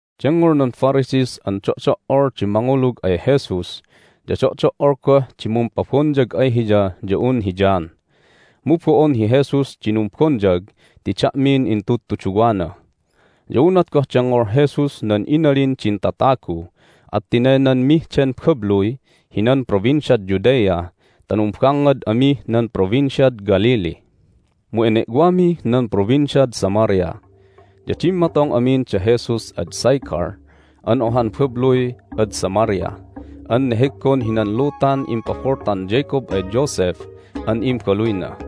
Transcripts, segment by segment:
Dengngol nan Pharisees an do'do"ol di mangulug ay Jesus ya do'do"ol goh di mumpabonyag ay Hiya ya un hi John. (Mu bo'on hi Jesus di numbonyag ti da'min intudtuduwana.) Ya unat goh dengngol Jesus nan inalin din tatagu at tinaynanmih den babluy hinan Provinciad Judea ta numbangngad amih nan Provinciad Galilee. Mu ene'wamih nan Provinciad Samaria. Ya dimmatong amin da Jesus ad Sychar an ohan babluy ad Samaria an neheggon hinan lutan impaboltan Jacob ay Joseph an imbaluyna.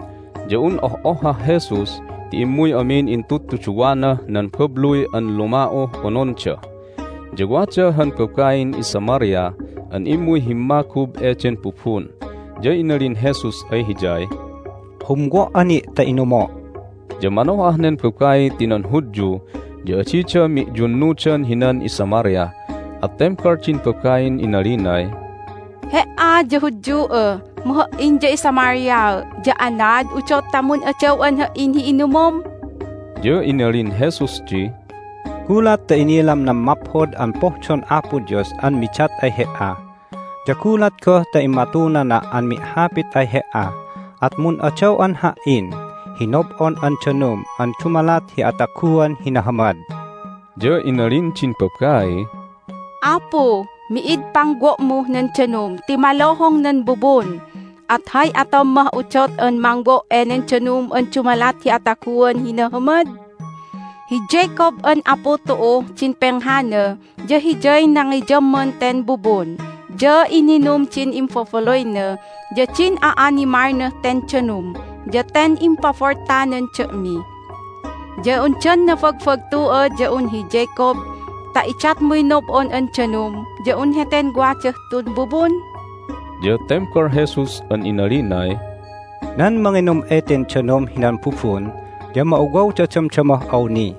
Ya un oh'ohhah Jesus ti immuy amin intudtuduwanah nan babluy an luma'uh ononda. Ya wada han babain iSamaria an immuy himmagub eden bubun. Ya inalin Jesus ay hiyay, "Humwo"a ni' ta inumo'." Ya manoh'ah nen babai ti nan Hudyu ya adida mi'yunnudan hinan iSamaria. At tembal din babain inalinay, "He"a ya Hudyu'a, mu ha"in ya iSamariaa', ya anaad udot ta mun'adaw'an ha"in hi inumom?" Ya inalin Jesus di, "Gulat ta inilam nan maphod an pohdon Apo Dios an midat ay he"a, ya gulat goh ta immatunana' an mi'hapit ay he"a at mun'adaw'an Ha"in hi nob'on an danum an dumalat hi ataguan hi nahamad." Ya inalin din babaiy, "Apu, mi'id pangwo'muh nan danum ti maluhung nan bubun! At hay atom mah udot an mangwo' enen danum an dumalat hi ataguan hi nahamad? Hi Jacob an apu tu'uh din penghana ya hiyay nangiyamman ten bubun, ya ininum din imbabaluyna ya din a'animalnah ten danum, ya ten impaboltanan da'mi. Ya undan nabagbagtu'a ya un hi Jacob ta idatmuy nob'on an danum ya un heten wadah tun bubun?" Ya tembal Jesus an inalinay, "Nan manginum eten danum hinan bubun ya ma'uwawda damdamah awni,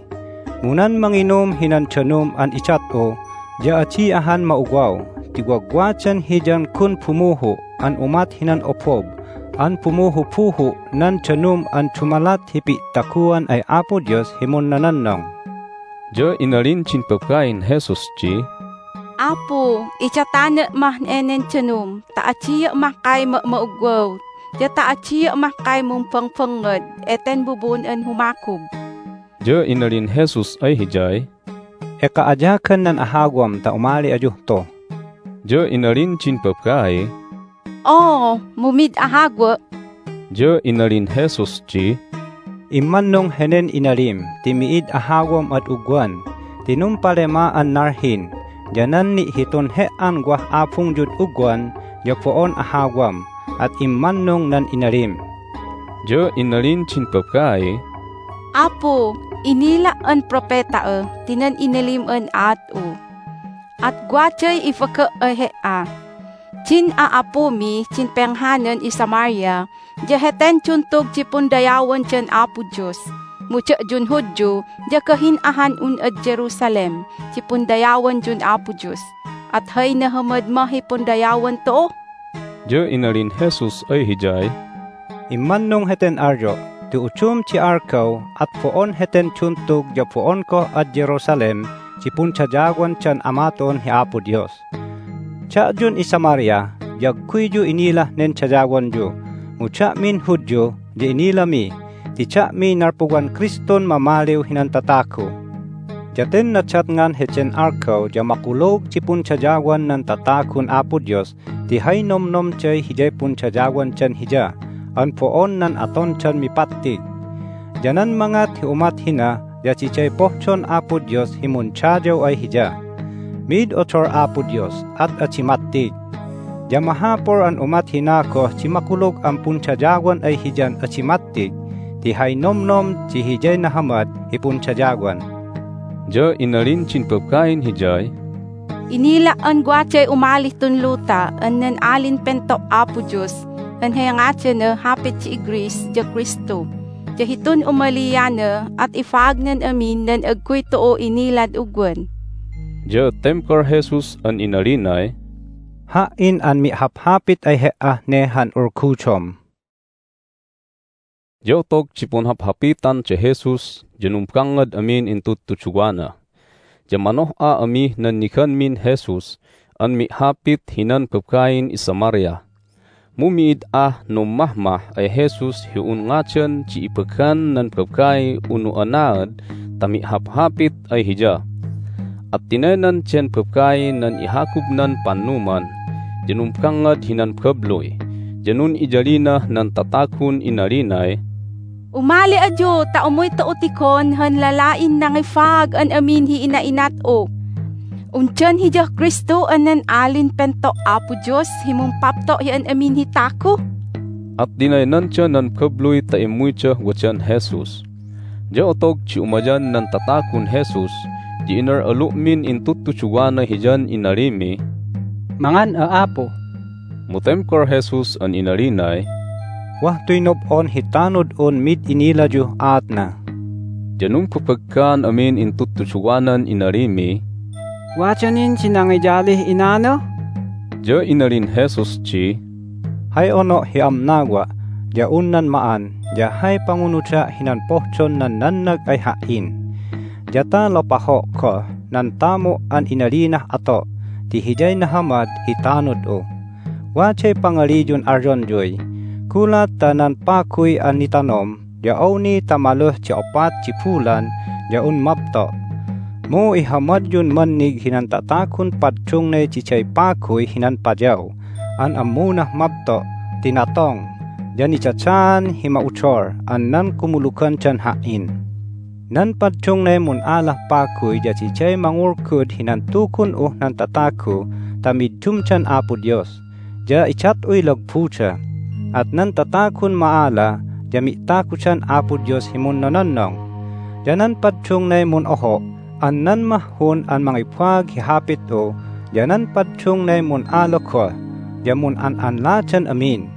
mu nan manginum hinan danum an idat'u ya adi ahan ma'uwaw ti wagwadan hiyan gun bumuhu' an umat hinan obob an bumuhubuhu' nan danum an dumalat hi pi'taguan ay Apo Dios hi munnononnong." Ya inalin din babain Jesus di, "Apu, idatana' mah enen danum ta adia' mahkay ma'ma'ugwaw ya ta adia' mahkay mumbangbangngad eten bubun an humagub!" Ya inalin Jesus ay hiyay, "Eka ayagan nan ahawam ta umali ayuh tu." Ya inalin din babaiy, "Oo, mu mid ahawa'." Ya inalin Jesus di, "Immannung henen inalim ti mi'id ahawam ad ugwan ti numpalema'an nalhin, ya nan ni'hitun he"an wah abungyud ugwan ya bo'on ahawam, at immannung nan inalim." Ya inalin din babaiy, "Apu, inila' an propeta'a ti nan inalim an aat'u! At waday ibaga' ay He"a: din a'apumih din penghanan iSamaria ya heten duntug di pundayawandan Apo Dios, mu da'yun Hudyu ya gah'in ahan un ad Jerusalem di pundayawanyun Apo Dios. At hay nahamad mah hi pundayawan tu'u?" Ya inalin Jesus ay hiyay, "Immannung heten alyo' ti udum di algaw at bo'on heten duntug ya bo'on goh ad Jerusalem di pundayawandan Ama tu'un hi Apo Dios. Da'yun iSamaria ya agguyyu inilah nen dayawonyu, mu da'min Hudyu ya inilami ti da'miy nalpuwan Kristun mamaliw hinan tatagu. Ya ten nadatngan heden algaw ya makulug di pundayawan nan tatagun Apo Dios ti hay nomnomday hiyay pundayawandan Hiya an bo'on nan atondan mipattig. Ya nan mangat hi umat hina ya diday pohdon Apo Dios hi mundayaw ay Hiya. Mi'id odol Apo Dios, at adi mattig. Ya mahapul an umat hina goh di makulug an pundayawan ay Hiyan adi mattig ti hay nomnom di hiyay nahamad hi pundayawan." Ya inalin din babain Hiyay, "Inila' an waday umalih tun luta an nan Alin Pento' Apo Dios an hay ngadanah hapit di iGreece ya Kristu. Ya hitun umaliana at ibaagnan amin nan agguy tu'u inilad ugwan." Ya tembal Jesus an inalinay, "Ha"in an mi'haphapit ay he"ah ne han ulgudom!" Ya otog di punhaphapitan da Jesus ya numbangngad amin intudtuduwana. Ya manoh'a amih nanniganmin Jesus an mi'hapit hinan babain iSamaria. Mu mi'id ah nummahmah ay Jesus hi un ngadan di ibagan nan babai unu anaad ta mi'haphapit ay hiya. At tinaynan den babai nan ihagubnan pannuman, ya numbangngad hinan babluy, ya nun'iyalinah nan tatagun inalinay, "Umali ayu ta umuy tu'u tigon han lala'in nangibaag an amin hi ina'inat'u! Undan Hiyah Kristu an nan Alin Pento' Apo Dios hi mumpapto' hi an amin hi tagu?" At tinaynanda nan babluy ta immuydah wadan Jesus. Ya otog di umayan nan tatagun Jesus ya inal'alu'min intudtuduwana Hiyan inalimiy, "Mangan'a, Apu!" Mu tembal Jesus an inalinay, "Wah tuy nob'on hi tanud'un mid inilayuh aatna." Ya numbabaggaan amin intudtuduwanan inalimiy, "Wada nin di nangiyalih inana?" Ya inalin Jesus di, "Hay ono' hi amnawa' ya un nan ma'an ya hay pangunuda' hinan pohdon nan nannag ay Ha"in, ya ta lopaho' goh nan tamu' an inalinah ato' ti hiyay nahamad hi tanud'u. Waday pangaliyun alyonyuy, Gulat ta nan paguy an nitanom ya awni ta maluh di opat di bulan ya un mabto'. Mu ihamadyun mannig hinan tatagun paddungnay diday paguy hinan payaw an ammunah mabto' ti natong ya nidadaan hi ma'udol an nan kumulugandan Ha"in. Nan paddungnay mun'alah paguy ya diday mangulgud hinan Tugun'uh nan tatagu ta middumdan Apo Dios, ya idat'uy lagbuda. At nan tatagun ma'ala ya mi'tagudan Apo Dios hi munnononnong. Ya nan paddungnay mun'oho' an nan mahhun an mangibaag hi Hapit'u ya nan paddungnay mun'ala goh ya mun'an'anladan amin.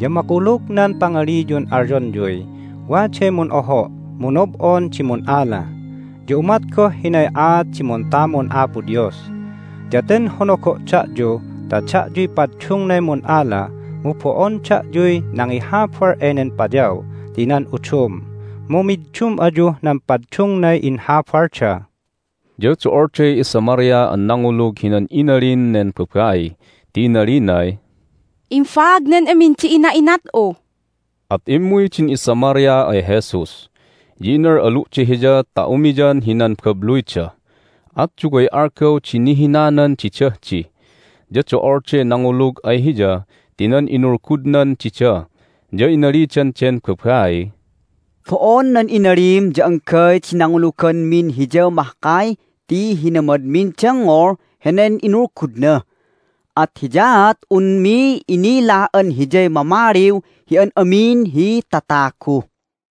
Ya makulug nan pangaliyun alyonyuy, Waday mun'oho', mu nob'on di mun'ala. Ya umat goh hinay aat di muntamun Apo Dios. Ya ten honogo' da'yu ta da'yuy paddungnay mun'ala, mu bo'on da'yuy nangihabal enen payaw ti nan udum, mu middum ayuh nan paddungnay inhabalda." Ya do'olday iSamaria an nangulug hinan inalin nen babai ti inalinay, "Imbaagnan amin di ina'inat'u!" At immuy din iSamaria ay Jesus, ya inal'alu'da Hiya ta umiyan hinan babluyda. At duway algaw di nihinanan didah di. Ya do'olday nangulug ay Hiya ti nan inulgudnan dida. Ya inalidan den babaiy, "Bo'on nan inalim ya anggay di nanguluganmin Hiya mahkay ti hinamadmin dengngol henen inulgudna, at hiyaat unmi inila an Hiyay Mamaliw hi an amin hi tatagu."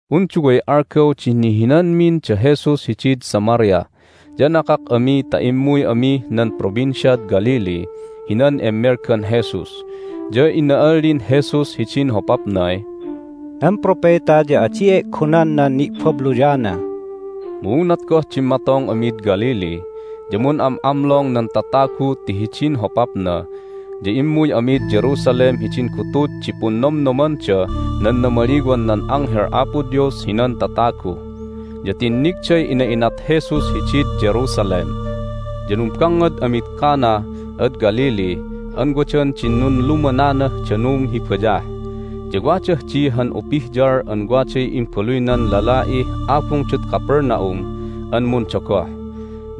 Un duway algaw di nihinanmin da Jesus hidid Samaria, ya nakak ami ta immuy amih nan Provinciad Galilee hinan emmelgan Jesus. Ya ina'allin Jesus hidin hopapnay, "Nan propeta ya adi e'gonan nan ni'babluyana." Mu unat goh dimmatong amid Galilee ya mun'am'amlong nan tatagu ti hidin hopapna ya immuy amid Jerusalem hidin gutud di Punnomnomandah nan Namaliwan nan Anghel Apo Dios hinan Tatagu, ya tinnigday inat'inat Jesus hidid Jerusalem. Ya numbangngad amid Cana ad Galilee an wadan din nunlumananah danum hi bayah. Ya wadah di han upihyal an waday imbaluynan lala'ih abungdad Capernaum an mundogoh.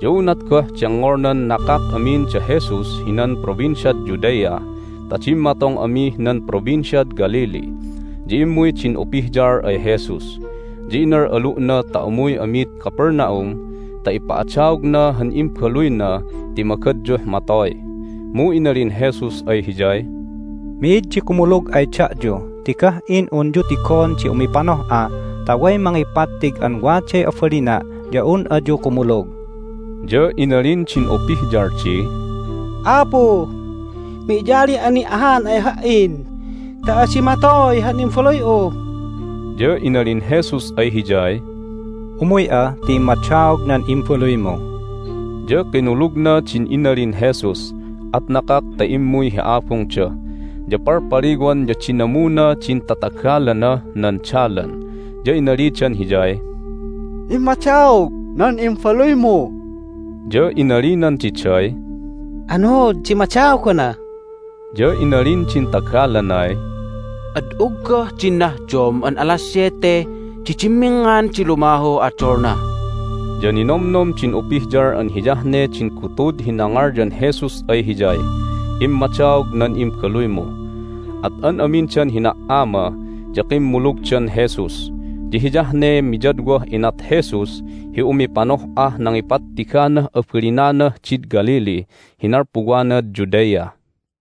Ya unat goh dengngolnan nakak amin da Jesus hinan Provinciad Judea ta dimmatong amih nan Provinciad Galilee ya immuy din upihyal ay Jesus, ya inal'alu'na ta umuy amid Capernaum ta ipa'adaogna han imbaluyna ti magadyuh matoy. Mu inalin Jesus ay hiyay, "Mi'id di kumulug ay da'yu ti gah'in unyu tigon di umipanoh'a ta way mangipattig an waday abalina' ya un ayu kumulug!" Ya inalin din upihyal di, "Apu, mi'yali'a ni' ahan ay ha"in ta adi matoy han imbaluy'u!" Ya inalin Jesus ay hiyay, "Umuy'a ti immadaog nan imbaluymu." Ya kinulugna din inalin Jesus, at nakak ta immuy hi abungda. Ya palpaliwan ya dinamuna din tatagalanah nan dalan, ya inalidan hiyay, "Immadaog nan imbaluymu!" Ya inalinan diday, "Anuud di immadaogana?" Ya inalin din tagalanay, "Ad uggah din nahdom an alas siyete di dimminngan di lumahuh odolna." Ya ninomnom din upihyal an hiyah ne din gutud hi nangalyan Jesus ay hiyay, "Immadaog nan imbaluymu." At an amindan hina"ama ya kimmulugdan Jesus. Ya hiyah ne miyadwah inat Jesus hi umipanoh'ah nangipattiganah abalinanah did Galilee hi nalpuwanad Judea.